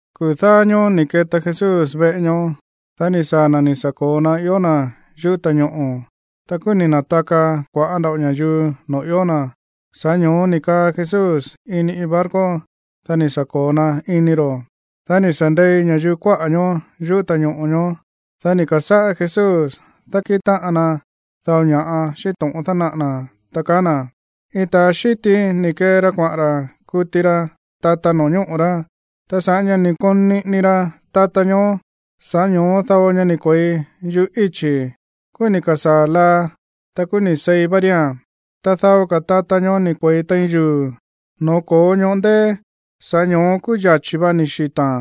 Kuu̱ dáá ñóó ni̱ keta Jesús veꞌe ñoó. Dá ni̱ saa̱ na̱ ni̱ sa̱ ko̱o na ió na̱ yuꞌú ta̱ñoꞌo̱. Ta kúú ni̱ na̱taka kua̱ꞌá nda̱ꞌo ña̱yuu noo̱ ió na̱. Sa̱ꞌá ño̱ó ni̱ kaa Jesús ini iin barco, dá ni̱ sa̱ ko̱o na ini ro̱. Dá ni̱ sa̱ ndei ña̱yuu kuáꞌa̱ ñoó yuꞌú ta̱ñoꞌo̱ ñoó. Dá ni̱ ka̱sáꞌá Jesús dákíꞌin táꞌan na dao ña̱ꞌa xíꞌín to̱ꞌon dánaꞌa̱ na̱, ta kaá na̱: ―Iin ta̱a xíti ni̱ kee ra kuaꞌa̱n ra̱ kuti ra tata no̱ñóꞌo̱ rá. Ta sa̱ꞌá ña̱ ni̱ koon niꞌini ra tata ñoó, sa̱ꞌá ño̱ó dao ña ni̱ kue̱i yuꞌú íchi̱. Kúú ni̱ ka̱sáa̱ laa, ta kúú ni̱ seí vá ría̱n. Ta dao ka̱ tata ñoó ni̱ kue̱i tein yuu̱, no̱ó ko̱ó ñoꞌó ndéé. Sa̱ꞌá ño̱ó kúú yachi̱ va ni̱ xita̱a̱n,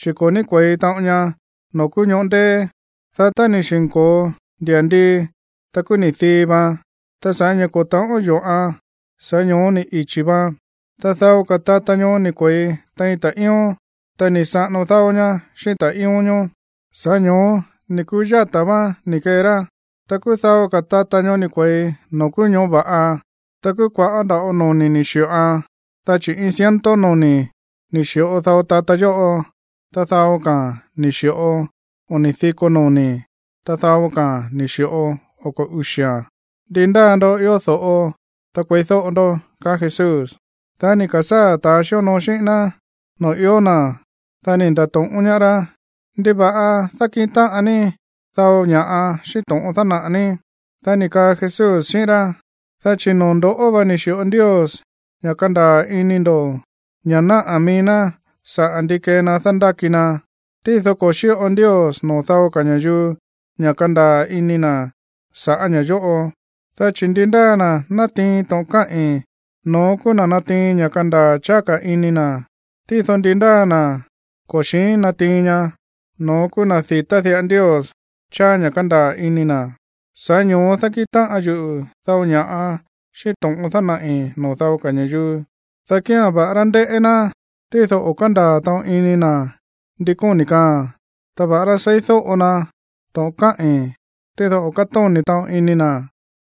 chi̱ ko̱ ní kue̱i taꞌon ña no̱ó kúú ñoꞌó ndéé. Dá tá ni̱ xi̱nko̱o ndia̱ndii, ta kúú ni̱ dii vaan. Ta sa̱ꞌá ña̱ ko̱ ta̱ꞌón yo̱ꞌan, sa̱ꞌá ño̱ó ni̱ ichi̱ vaan. Ta dao ka̱ tata ñoó ni̱ kue̱i tein ta̱ꞌíón. Ta ni̱ saꞌano dáó ñá xíꞌín ta̱ꞌíón ñoó, sa̱ꞌá ño̱ó ni̱ ku̱yáta̱ váán ni̱ kee rá. Ta kúú dao ka̱ tata ñoó ni̱ kue̱i noo̱ kúú ñoꞌó va̱ꞌa. Ta kúú kua̱ꞌá nda̱ꞌo noni̱ ni̱ xi̱ꞌoan, dá chi̱ iin ciento noni̱ ni̱ xi̱ꞌo dao tata yóꞌo, ta dao ka̱a̱n ni̱ xi̱ꞌo oni̱ diko noni̱, ta dao ka̱a̱n ni̱ xi̱ꞌo oko̱ uxi̱a̱n. Ndi ndáa ndoꞌó ió do̱ꞌo, ta kueídóꞌo ndó ―kaá Jesús. Dá ni̱ ka̱sáa̱ ta̱ xíonoo xíꞌín ná noo̱ ió na̱, dá ni̱ nda̱to̱ꞌón ñaá rá: ―¿Ndiva̱ꞌa dákíꞌin táꞌan ní dao ña̱ꞌa xíꞌín to̱ꞌon dánaꞌa̱ ní? Dá ni̱ kaa Jesús xíꞌín rá: ―Dá chi̱ noo̱ ndo̱ꞌó va ni̱ xi̱ꞌo Ndios ña̱ kandaa̱ ini ndo̱ ña̱ náꞌá mií ná sa̱ꞌá ndi kee na dándáki na. Tído ko̱ xíꞌo Ndios noo̱ dao ka̱ ña̱yuu ña̱ kandaa̱ ini na̱ sa̱ꞌá ña̱ yóꞌo. Dá chi̱ ndi ndáa na̱ ni̱ na̱tiin to̱ꞌon káꞌi̱n, no̱ón kúú na̱ natiin ña̱ kandaa̱ cháá ka̱ ini na̱. Tído ndi ndáa na̱ ko̱ xi̱ín natiin ña, no̱ón kúú na̱ di̱tá diꞌa Ndios cháá ña̱ kándaa̱ ini na̱. Sa̱ꞌá ño̱ó dákíꞌin táꞌan yuꞌu̱ dao ña̱ꞌa xíꞌín to̱ꞌon dánaꞌi̱ no̱ó dao ka̱ ña̱yuu, dá kía̱n, va̱ꞌará ndéꞌé ná, tído o̱ kándaa̱ taꞌon ini na̱ ndi kóni̱ kaaa̱n, ta va̱ꞌará seídóꞌo na to̱ꞌon káꞌi̱n, tído o̱ kátóni̱ taꞌon ini na̱.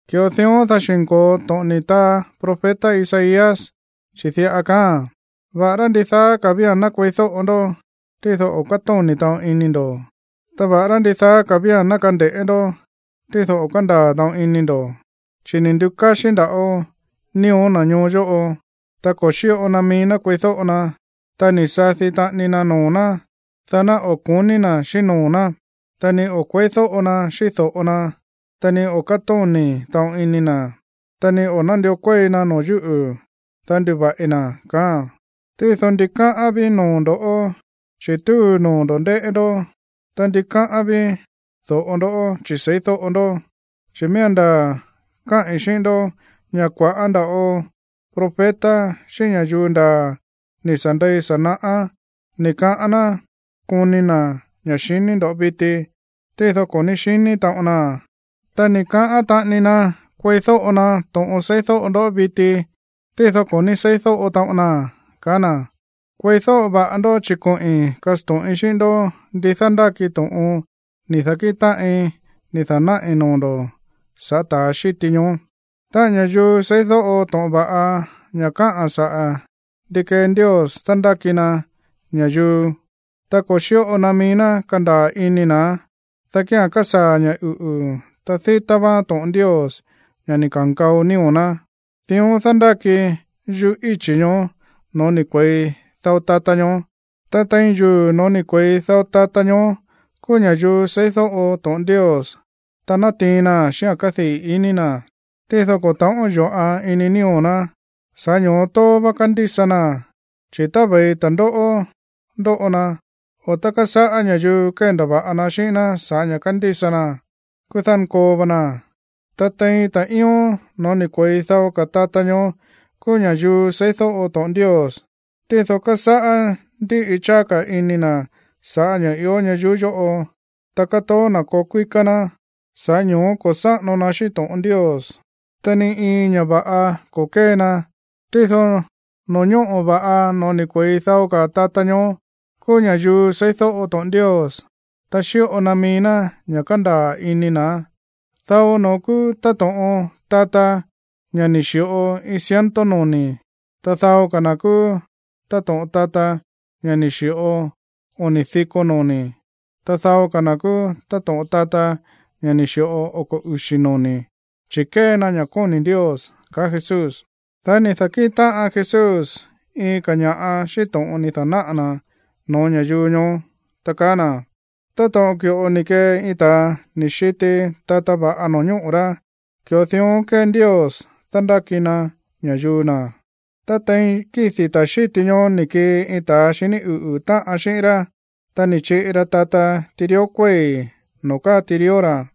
Ki̱ꞌo dión, dá xi̱nko̱o to̱ꞌon ni̱ taa profeta Isaías, chi̱ diꞌa kaáa̱n: Va̱ꞌará ndidaa ka̱ vía̱n ná kueídóꞌo ndó, tído o̱ kátóni̱ taꞌon ini ndo̱. Ta va̱ꞌará ndidaa ka̱ vía̱n ná kande̱ꞌé ndó, tído o̱ kándaa̱ taꞌon ini ndo̱. Chi̱ ni̱ ndukáxí nda̱ꞌo nío̱ na̱ ñoo yóꞌo, ta ko̱ xíꞌo na mií ná kueídóꞌo na, ta ni̱ sadi taꞌani na noo̱ ná, dá ná o̱ ko̱ní na̱ xíꞌín noo̱ ná, ta ni o̱ kueídóꞌo na xíꞌín do̱ꞌo na, ta ni o̱ kátóni̱ taꞌon ini na̱, ta ni o̱ nándió kuéi na noo̱ yúꞌu̱, dá nduva̱ꞌi na̱. ’Tído ndikáꞌán ví noo̱ ndo̱ꞌó, chi̱ túu noo̱ ndo̱ ndéꞌé ndó, ta ndikáꞌán ví do̱ꞌo ndó, chi̱ seídóꞌo ndó. Chi̱ miía̱n ndaa̱ káꞌi̱n xíꞌín ndó ña̱ kua̱ꞌá nda̱ꞌo profeta xíꞌín ña̱yuu ndaa̱ ni̱ sa̱ ndei sa̱ naꞌá ni̱ kaꞌán ná koni na̱ ña̱ xiní ndo̱ viti, tído ko̱ ní xiní taꞌon naa̱n. Ta ni̱ kaꞌán taꞌani na kueídóꞌo na to̱ꞌon seídóꞌo ndó viti, tído ko̱ ní seídóꞌo taꞌon naa̱n ―kaá na̱. ―Kueídóꞌo va̱ꞌa ndó, chi̱ koꞌi̱n kasto̱ꞌin xíꞌín ndó ndi dándáki to̱ꞌon ni̱ da̱kíꞌin táꞌin ni̱ da̱náꞌi̱ noo̱ ndo̱ sa̱ꞌá ta̱ xíti ñoó. Táꞌa̱n ña̱yuu seídóꞌo to̱ꞌon va̱ꞌa ña̱ káꞌa̱n saꞌa̱ ndi kée Ndios dándáki na ña̱yuu, ta ko̱ xíꞌo na mií ná kandaa̱ ini na̱án, dá kía̱n kasaa̱ ña̱ uꞌu̱, ta dítá váán to̱ꞌon Ndios, ña̱ ni̱ ka̱nkao nío̱ ná. Dión dándáki yuꞌú íchi̱ ñoó no̱ó ni̱ kue̱i dao tata ñoó. Ta tein yuu̱ no̱ó ni̱ kue̱i dao ka̱ tata ñoó kúú ña̱yuu seídóꞌo to̱ꞌon Ndios, ta nátiin naa̱n xíꞌa̱n kádii̱ ini na̱. Tído ko̱ ta̱ꞌón yo̱ꞌan ini nío̱ ná, sa̱ꞌá ño̱ó tóó vá kándísa naa̱n. Chi̱ tá ve̱i ta̱ndóꞌó ndóꞌo na, o tá kásáꞌá ña̱yuu kéndava̱ꞌa na xíꞌín ná sa̱ꞌá ña̱ kándísa naa̱n, kúú dánkoo va naa̱n. Ta tein ta̱ꞌíón no̱ó ni̱ kue̱i dao ka̱ tata ñoó kúú ña̱yuu seídóꞌo to̱ꞌon Ndios. Tído kásáꞌá ndíꞌi cháá ka̱ ini na̱ sa̱ꞌá ña̱ꞌa ió ñayuú yóꞌo, ta kátoó na̱ koo kuíká ná. Sa̱ꞌá ño̱ó ko̱ sáꞌano na xíꞌín to̱ꞌon Ndios, ta ni iin ña̱ va̱ꞌa ko̱ kée na. Tído no̱ñóꞌo̱ va̱ꞌa no̱ó ni̱ kue̱i dao ka̱ tata ñoó kúú ña̱yuu seídóꞌo to̱ꞌon Ndios, ta xíꞌo na mií ná ña̱ kándaa̱ ini na̱án. Dao no̱ón kúú táto̱ꞌon tata, ña̱ ni̱ xi̱ꞌo iin ciento noni̱. Ta dao ka̱ na̱ kúú táto̱ꞌon tata, ña̱ ni̱ xi̱ꞌo oni̱ diko noni̱. Ta dao ka̱ na̱ kúú táto̱ꞌon tata, ña̱ ni̱ xi̱ꞌo oko̱ uxi̱ noni̱, chi̱ kée na ña̱ kóni̱ Ndios ―kaá Jesús. Dá ni̱ da̱kíꞌin táꞌan Jesús iin ka̱ ña̱ꞌa xíꞌín to̱ꞌon ni̱ da̱náꞌa̱ na̱ no̱ó ña̱yuu ñoó, ta kaá na̱: ―Táto̱ꞌon ki̱ꞌo ni̱ kee iin ta̱a ni̱ xiti tata va̱ꞌa no̱ñóꞌo̱ rá, ki̱ꞌo dión kée Ndios dándáki na ña̱yuu na̱. Ta tein kídi̱ ta̱ xíti ñoó, ni̱ kii iin ta̱ xiní uꞌu̱ táꞌan xíꞌín rá, ta ni̱ chiꞌi ra tata tirió kuéi̱ noo̱ káa tirió ra̱.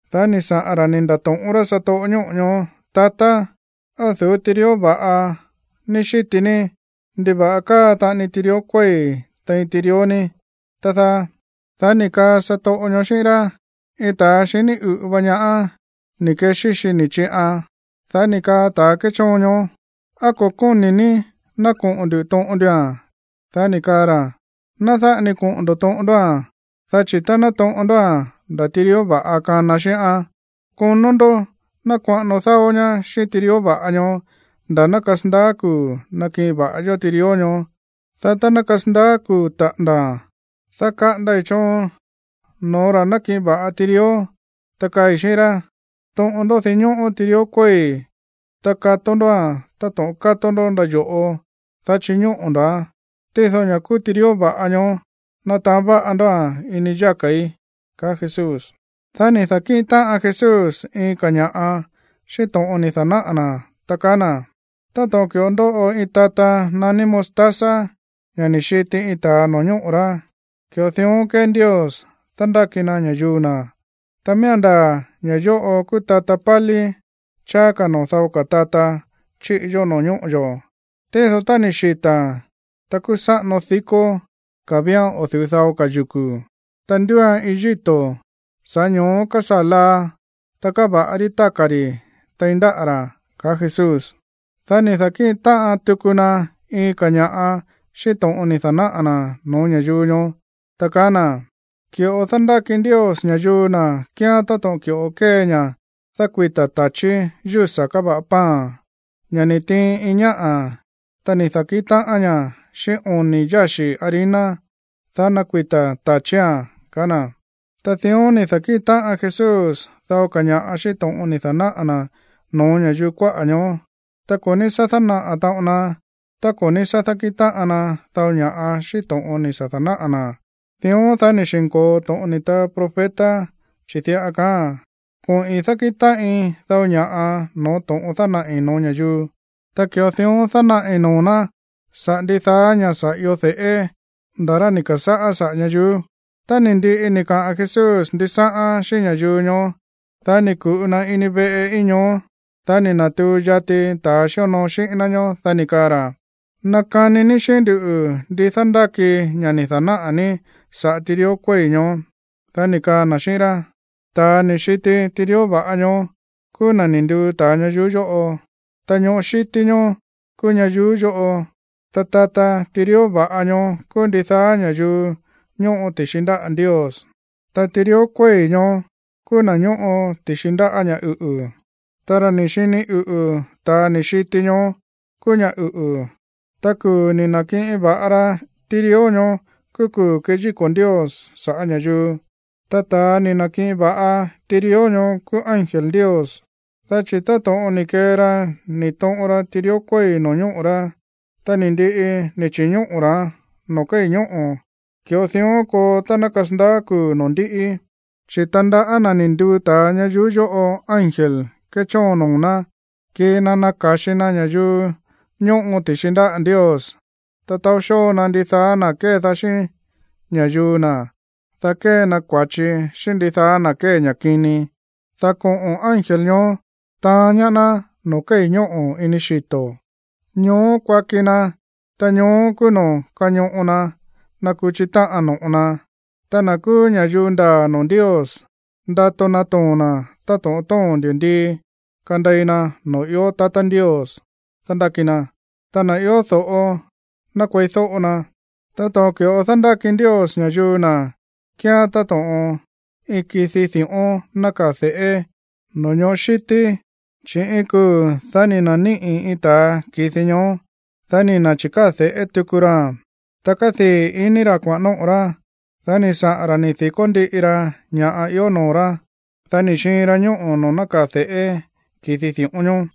Dá ni̱ saꞌa̱n ra̱ ni̱ nda̱to̱ꞌón rá satoꞌo ñóꞌo̱ ñoó: “Tatá, ¿á o̱ du̱ú tirió va̱ꞌa ní xíti ní? ¿Ndiva̱ꞌa káa taꞌani tirió kuéi̱ tein tirió ní, tá dáá?” Dá ni̱ kaa satoꞌo ñoó xíꞌín rá: “Iin ta̱a xiní uꞌu̱ va ñaá ni̱ kexíxi ni̱ chiꞌan.” Dá ni̱ kaa ta̱ kéchóon ñoó: “¿Á ko̱ kóni̱ ní ná koꞌo̱n ndu̱ toꞌon ndua̱n?” Dá ni̱ kaa ra̱: “Ná dáꞌa ni koꞌo̱n ndo̱ toꞌon ndóa̱n, dá chi̱ tá ná toꞌon ndóa̱n, nda̱ tirió va̱ꞌa kana xíꞌán. Konó ndó ná kuaꞌano dáó ñá xíꞌín tirió va̱ꞌa ñoó nda̱ ná kasandaá kuu̱ nakiꞌin va̱ꞌa yó tirió ñoó. Dá tá ná kasandaá kuu̱ taꞌa̱nda̱a̱n, dá kaꞌandai̱ choon no̱ó ra̱ nákiꞌin va̱ꞌa tirió, ta kaai̱ xíꞌín rá: Toꞌon ndó dinñóꞌó tirió kuéi̱, ta kató ndóa̱n táto̱ꞌon kató ndó ndáyo̱ꞌo, dá chiñóꞌo̱ ndo̱án. Tído ña̱ kúú tirió va̱ꞌa ñoó, ná taán va̱ꞌa ndóa̱n ini yáka̱í” ―kaá Jesús. Dá ni̱ da̱kíꞌin táꞌan Jesús iin ka̱ ña̱ꞌa xíꞌín to̱ꞌon ni̱ da̱náꞌa̱ na̱, ta kaá na̱: ―Táto̱ꞌon ki̱ꞌo ndóꞌo iin tata naní mostaza, ña̱ ni̱ xiti iin ta̱a no̱ñóꞌo̱ rá, ki̱ꞌo dión kée Ndios dándáki na ña̱yuu na̱. Ta miía̱n ndaa̱ ña̱ yóꞌo kúú tata pálí cháá ka̱ noo̱ dao ka̱ tata chíꞌi yó no̱ñóꞌo̱ yo̱. Tído tá ni̱ xita̱a̱n, ta kúú sáꞌano dikó ka̱ vía̱n o̱ du̱ú dao ka̱ yuku̱, ta ndúuan iin yíto̱, sa̱ꞌá ño̱ó kásaa̱ laa, ta káva̱ꞌa rí táka̱ ri̱ tein ndáꞌa̱ rá ―kaá Jesús. Dá ni̱ da̱kíꞌin táꞌan tuku na iin ka̱ ña̱ꞌa xíꞌín to̱ꞌon ni̱ da̱náꞌa̱ na̱ no̱ó ña̱yuu ñoó, ta kaá na̱: ―Ki̱ꞌo dándáki Ndios ña̱yuu na̱ kíán táto̱ꞌon ki̱ꞌo kée ña̱ dákuita̱ ta̱chí yúsa̱ káva̱ꞌa pan, ña̱ ni̱ tiin iin ñáꞌa̱, ta ni̱ da̱kíꞌin táꞌan ñaá xíꞌín oni̱ yáxi̱ harina, dá nakuita̱ ta̱chía̱n ―kaá na̱. Ta dión ni̱ da̱kíꞌin táꞌan Jesús dao ka̱ ña̱ꞌa xíꞌín to̱ꞌon ni̱ da̱náꞌa̱ na̱ no̱ó ña̱yuu kuáꞌa̱ ñoó. Ta ko̱ ní sá dánaꞌa̱ taꞌon na tá ko̱ ní sá dákíꞌin táꞌan na dao ña̱ꞌa xíꞌín to̱ꞌon ni̱ sa̱ da̱náꞌa̱ na̱. Dión, dá ni̱ xi̱nko̱o to̱ꞌon ni̱ taa profeta, chi̱ diꞌa kaáa̱n: Koꞌi̱n dákíꞌin táꞌin dao ña̱ꞌa no̱ó to̱ꞌon dánaꞌi̱ no̱ó ña̱yuu. Ta ki̱ꞌo dión dánaꞌi̱ noo̱ ná saꞌa̱ ndidaá ña̱ sa̱ io de̱ꞌé nda̱ rá ni̱ ka̱sáꞌá saꞌa̱ ñayuú. Tá ni̱ ndiꞌi ni̱ kaꞌa̱n Jesús ndisáꞌán xíꞌín ña̱yuu ñoó, dá ni̱ ku̱ꞌu na ini veꞌe íin ñoó. Dá ni̱ na̱tuu yati ta̱ xíonoo xíꞌín ná ñoó, dá ni̱ kaa ra̱: ―Nakani ní xíꞌín nduꞌu̱ ndi dándáki ña̱ ni̱ da̱náꞌa̱ ní saꞌa̱ tirió kuéi̱ ñoó. Dá ni̱ kaa na̱ xíꞌín rá: ―Ta̱a ni̱ xiti tirió va̱ꞌa ñoó kúú na̱ ni̱ nduu ta̱a ñayuú yóꞌo. Ta ñoꞌó xítí ñóó kúú ñayuú yóꞌo, ta tata tirió va̱ꞌa ñoó kúú ndidaá ña̱yuu ñóꞌo ti̱xi ndáꞌa̱ Ndios, ta tirió kuéi̱ ñoó kúú na̱ ñóꞌo ti̱xi ndáꞌa̱ ña̱ uꞌu̱. Táꞌa̱n ra̱ ni̱ xini uꞌu̱ ta̱ ni̱ xiti ñoó kúú ña̱ uꞌu̱, ta kuu̱ ni̱ na̱kiꞌin va̱ꞌa ra tirió ñoó kúú kuu̱ keyíko̱ Ndios sa̱ꞌá ña̱yuu. Ta ta̱a ni̱ na̱kiꞌin va̱ꞌa tirió ñoó kúú ángel Ndios. Dá chi̱ táto̱ꞌon ni̱ kee ra ni̱ toꞌon ra tirió kuéi̱ no̱ñóꞌo̱ rá, ta ni̱ ndiꞌi ni̱ chi̱ñóꞌo̱ ra̱án noo̱ kéi̱ ñóꞌo̱, ki̱ꞌo dión koo tá ná kasandaá kuu̱ noo̱ ndíꞌi. Chi̱ tandaꞌá na̱ ni̱ nduu ta̱a ñayuú yóꞌo ángel kéchóon noo̱ ná kii na naka̱xi na ña̱yuu ñóꞌo ti̱xi ndáꞌa̱ Ndios, ta taó xóo na ndidaá na̱ kédaá xíꞌín ña̱yuu na̱, dá kée na kua̱chi xíꞌín ndidaá na̱ kée ña̱ kini. Dá koꞌo̱n ángel ñoó taán ñaá ná noo̱ kéi̱ ñóꞌo̱ ini xito̱. Ñoó kuaki na, ta ñoó kúú noo̱ kañoꞌo na nakuchi táꞌan no̱ꞌo na. Ta na̱ kúú ña̱yuu ndaa̱ noo̱ Ndios, ndato natoo̱n na̱ táto̱ꞌon tóo̱n ndi̱ndii kandei na noo̱ ió tatá Ndios dándáki na. Ta na̱ ió do̱ꞌo, ná kueídóꞌo na. ’Táto̱ꞌon ki̱ꞌo dándáki Ndios ña̱yuu na̱ kíán táto̱ꞌon iin ki̱di di̱ꞌón nákaa̱ de̱ꞌé no̱ñoꞌó xítí. Chi̱ iin kuu̱, dá ni̱ na̱níꞌi̱ iin ta̱a ki̱di ñoó, dá ni̱ na̱chi̱káa̱ de̱ꞌé tuku raa̱n, ta kádii̱ ini ra̱ kuaꞌa̱n nóꞌo̱ rá. Dá ni̱ saꞌa̱n ra̱ ni̱ di̱kó ndíꞌi ra ña̱ꞌa ió noo̱ rá, dá ni̱ xiin ra ñóꞌo̱ noo̱ nákaa̱ de̱ꞌé ki̱di di̱ꞌón ñoó.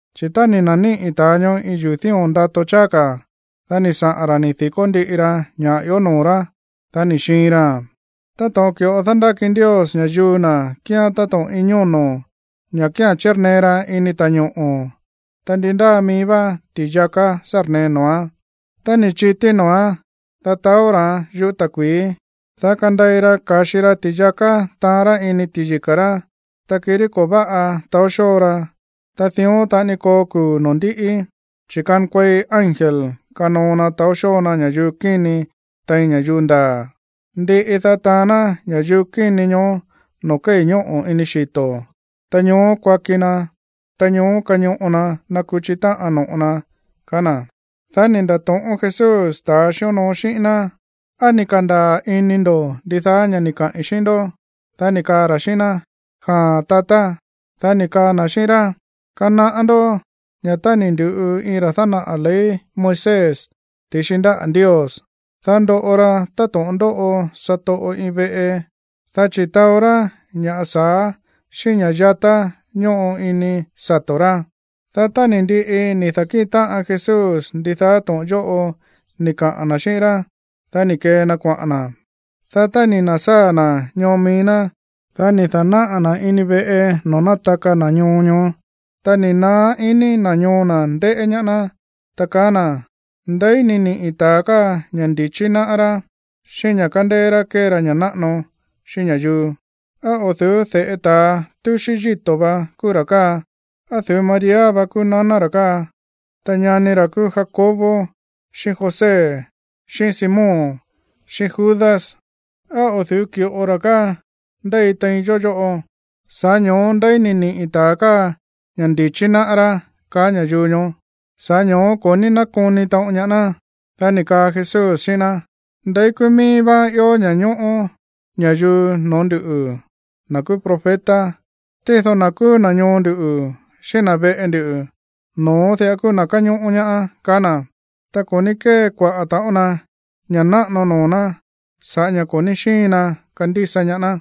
Chi̱ tá ni̱ na̱níꞌi̱ ta̱a ñoó iin yuu̱ dío̱n ndato cháá ka̱, dá ni̱ saꞌa̱n ra̱ ni̱ di̱kó ndíꞌi ra ña̱ ió noo̱ rá, dá ni̱ xiin raa̱n. ’Táto̱ꞌon ki̱ꞌo dándáki Ndios ña̱yuu na̱ kíán táto̱ꞌon iin ñóno̱, ña̱ kía̱n chírnee ra ini ta̱ñoꞌo̱, ta ndi ndáa mií vá ti̱yaká sárnee noo̱án. Tá ni̱ chití noo̱án, dá taó ra̱án yuꞌú ta̱kui̱í, dá kandei ra ka̱xi ra ti̱yaká taán ra̱ ini ti̱yika̱ rá, ta kirí ko̱ váꞌa taó xóo ra. Ta dión taꞌani koo kuu̱ noo̱ ndíꞌi, chi̱ kankuei ángel kanoo na taó xóo na ña̱yuu kíni tein ña̱yuu ndaa̱. Ndiꞌi, dá taán ná ña̱yuu kíni ñoó noo̱ kéi̱ ñóꞌo̱ ini xito̱. Ta ñoó kuaki na, ta ñoó kañoꞌo na nakuchi táꞌan no̱ꞌo na ―kaá na̱. Dá ni̱ nda̱to̱ꞌón Jesús ta̱ xíonoo xíꞌín ná: ―¿Á ni̱ ka̱ndaa̱ ini ndo̱ ndidaá ña̱ ni̱ kaꞌi̱n xíꞌín ndó? Dá ni̱ kaa ra̱ xíꞌín ná: ―Jaa̱n, tatá. Dá ni̱ kaa na̱ xíꞌín rá: ―Kanaꞌá ndó ña̱ tá ni̱ ndu̱ꞌu iin ra̱ dánaꞌa̱ ley Moisés ti̱xi ndáꞌa̱ Ndios, dá ndoꞌo ra táto̱ꞌon ndóꞌo satoꞌo iin veꞌe, dá chi̱ taó rá ña̱ sa̱á xíꞌín ña̱ yatá ñóꞌo ini sato̱ rá. Dá tá ni̱ ndiꞌi ni̱ da̱kíꞌin táꞌan Jesús ndidaá to̱ꞌon yóꞌo ni̱ kaꞌa̱n na̱ xíꞌín rá, dá ni̱ kee na kuaꞌa̱n na̱. Dá tá ni̱ na̱sáa̱ na̱ ñoo mií ná, dá ni̱ da̱náꞌa̱ na̱ ini veꞌe noo̱ nátaka na̱ ñoo ñoó. Ta ni̱ naá ini na̱ ñoo na̱ ndéꞌé ñaá ná, ta kaá na̱: ―¿Ndeí ni̱ niꞌi̱ ta̱a káa ña̱ ndi̱chí náꞌá rá, xíꞌín ña̱ kándéé rá kée ra ña̱ náꞌano xíꞌín ña̱yuu? ¿Á o̱ du̱ú de̱ꞌe ta̱a túxí yíto̱ vá kúú ra̱ káa? ¿Á o̱ du̱ú María va kúú naná ra̱ káa, ta ñani ra̱ kúú Jacobo xíꞌín José, xíꞌín Simón, xíꞌín Judas? ¿Á o̱ du̱ú ki̱ꞌo ra̱ káa ndéi tein yó yóꞌo? Sa̱ꞌá ño̱ó, ¿ndeí ni̱ niꞌi̱ ta̱a káa ña̱ ndi̱chí náꞌá rá? ―kaá ña̱yuu ñoó. Sa̱ꞌá ño̱ó ko̱ ní nákoni taꞌon ñaá ná. Dá ni̱ kaa Jesús xíꞌín ná: ―Ndeí kúú míí vá ió ña̱ñóꞌó ña̱yuu no̱ó nduꞌu̱, na̱ kúú profeta. Tído na̱ kúú na̱ ñoo ndu̱, xíꞌín na̱ veꞌe ndu, no̱ón diꞌa kúú na̱ káñóꞌó ñaá ―kaá na̱. Ta ko̱ ní kée kuaꞌa̱ taꞌon na ña̱ náꞌano noo̱ ná sa̱ꞌá ña̱ ko̱ ní xíin na kandísa ñaá ná.